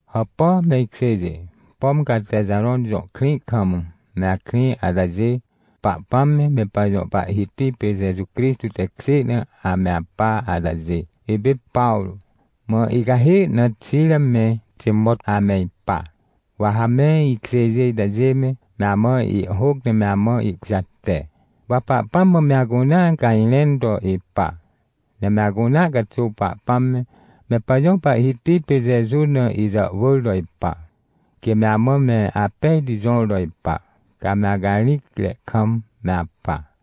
Hàpà, me ikjêjê, pom ca Texarõn jõ krĩ kam me akrĩ atajê, Pahpãm me, me pajõ Pahhiti pê Jeju Crixtô tekjê na ame apa atajê. Ipê Pawrô, mã icahê na Xira me Timot ame ipa. Wa ha me ikjêjê itajê me, me amã ihhôc ne me amã ihkujate. Wa Pahpãm mã me acunea cajrẽn to ipa, ne me acunea caxuw Pahpãm me, me pajõ Pahhiti pê Jeju na ijàhwỳr to ipa, quê me amã me apejti jõr to ipa, ca me acarĩcre kam me apa.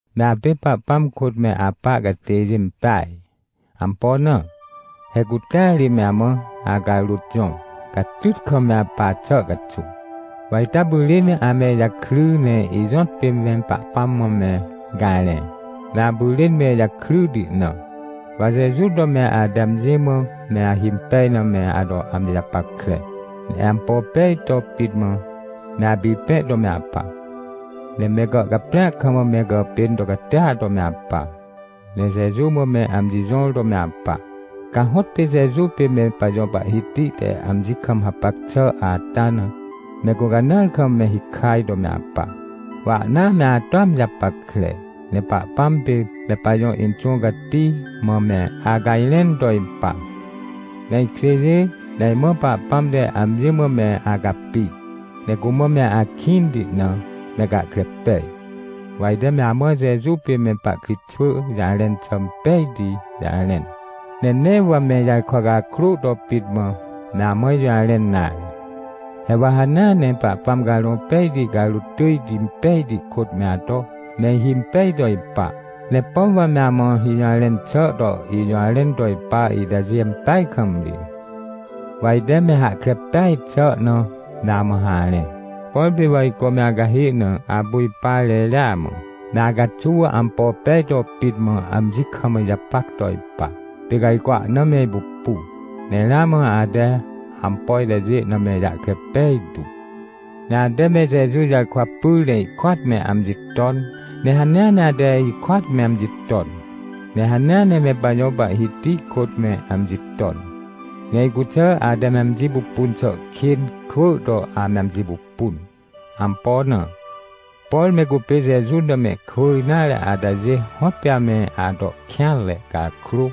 Me apê Pahpãm kôt me apa catêjê impeaj. Ampo na? He cutea ri me amã acarôt jõr, catyt kam me apa xà caxuw. Wa ita pyrên ame ijakry ne ijõtpê me Pahpãm mã me garẽ, me apyrên me ijakryti na. Wa Jeju to me ate amji mã me ahimpej na me ato amji japackre, ne ampo pejti to pit mã me apipẽ to me apa, ne me gàhcaprĩa kam me gàpên to catia to me apa, ne Jeju mã me amji jõr to me apa. Ca hõtpê Jeju pê me pajõ Pahhiti te amji kam hapac xà ata na, me gũcanãar kam me hikaj to me apa. Wa ahna me atoa amji japackre, ne Pahpãm pê me pajõ Inxũ Cati mã me acajrẽn to ipa. Me ikjêjê, me imã, Pahpãm te amji mã me acapi, ne cumã me akĩnti na, me gahkre pej. Wa ite me amã Jeju pê me pahkritxwỳ jarẽn xà impejti jarẽn, ne nee wa me ijarkwa cakrô to pit mã me amã ijũjarẽn nare. He wa hanea ne Pahpãm Carõ Pejti carôt tỳjti pejti kôt me ato me ihimpej to ipa, ne pom wa me amã ijũjarẽn xà to ijũjarẽn to ipa itajê ampeaj kam ri. Wa ite me hahkre peaj xà na me amã harẽ. Por pê wa ajco me acahê na apu ipa reria mã, me acaxuw ampo pej to pit mã amji kam ijapac to ipa, pê ca ajco ahna me ipupu. Ne ramã ate ampo itajê na me ijahkre pejtu. Ne ate me Jeju jarkwa pyr ne ihkôat me amji ton, ne hanea ne ate ikôat me amji ton, ne hanea ne me pajõ Pahhiti kôt me amji ton. Ne icuxà ate me amji pupun xà kên kwỳ to ame amji pupun. Ampo na? Por me cupê Jeju na mehkwỳ nare atajê hõtpê ame ato kêanre cakrô,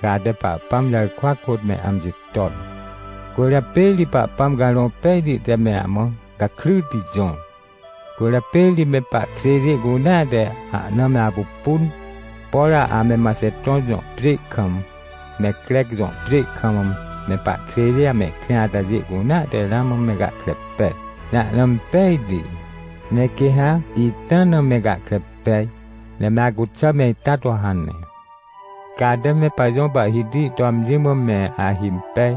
ca ate Pahpãm jarkwa kôt me amji ton. Cwỳrjapê ri Pahpãm Carõ Pejti te me amã gakryti jõr. Cwỳrjapê ri me pahkjêjê cunea te ahna me apupun. Por ame Maxeton jõ pjê kam, me Crec jõ pjê kam me pahkjêjê amehkrĩ atajê cunea te ramã me gahkre pej. Ne ahna impejti, ne quê ha ita na me gahkre pej, ne me acuxà me ita to hane. Ca ate me pajõ Pahhiti to amji mã me ahimpej.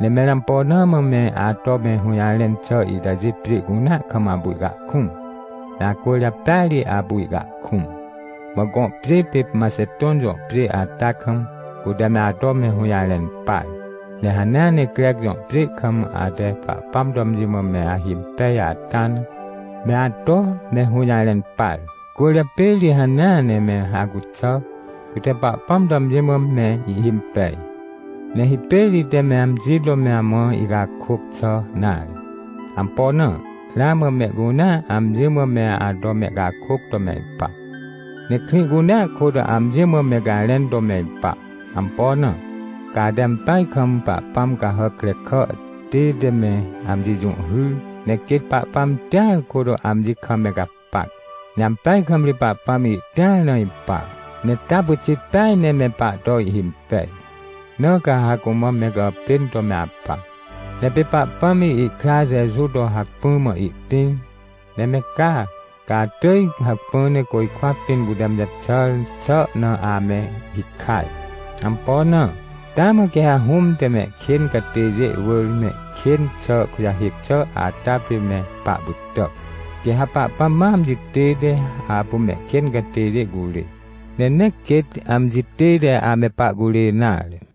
Ne mẽr ampo na mã me ato me hũjarẽn xà itajê pjê cunea kam apu ihcahkũm? Me acwỳrjapêa ri apu ihcahkũm. Mã gõ pjê pê Maxeton jõ pjê ata kam, cute me ato me hũjarẽn par, ne hanea ne Crec jõ pjê kam ate Pahpãm to amji mã me ahimpej ata na, me ato me hũjarẽn par. Cwỳrjapê ri hanea ne me acuxà, cute Pahpãm to amji mã me ihhimpej. Ne hipêr ite me amji to me amã icakôc xà nare. Ampo na? Ramã mehcunea amji mã me ato mehcakôc to me ipa. Ne krĩ cunea kôt amji mã me garẽn to me ipa. Ampo na? Ca ate ampeaj kam pahpãm cahàc krekà tête me amji jũhhyr, ne quêt Pahpãm tĩar kôt amji kam me gapac. Ne ampeaj kam ri Pahpãm ihtĩar na ipa, ne taa pyxit peaj ne me pahto ihhimpej. Na ca ha cumã me gàpên to me apa. Ne pê Pahpãm ihkra Jeju to hacpỹ mã ihtĩr, ne me ca, ca atỳj hacpỹ ne côjkwa pĩn cute amji jaxàr xà na ame hikaj. Ampo na? Taa mã quê ha Hũm te mehkên catêjê wỳr mehkên xà kujahêc xà ata pê me pahpytà. Quê ha Pahpãm ma amji tête apu mehkên catêjê curê, ne nee quêt amji tête ame pahcurê nare.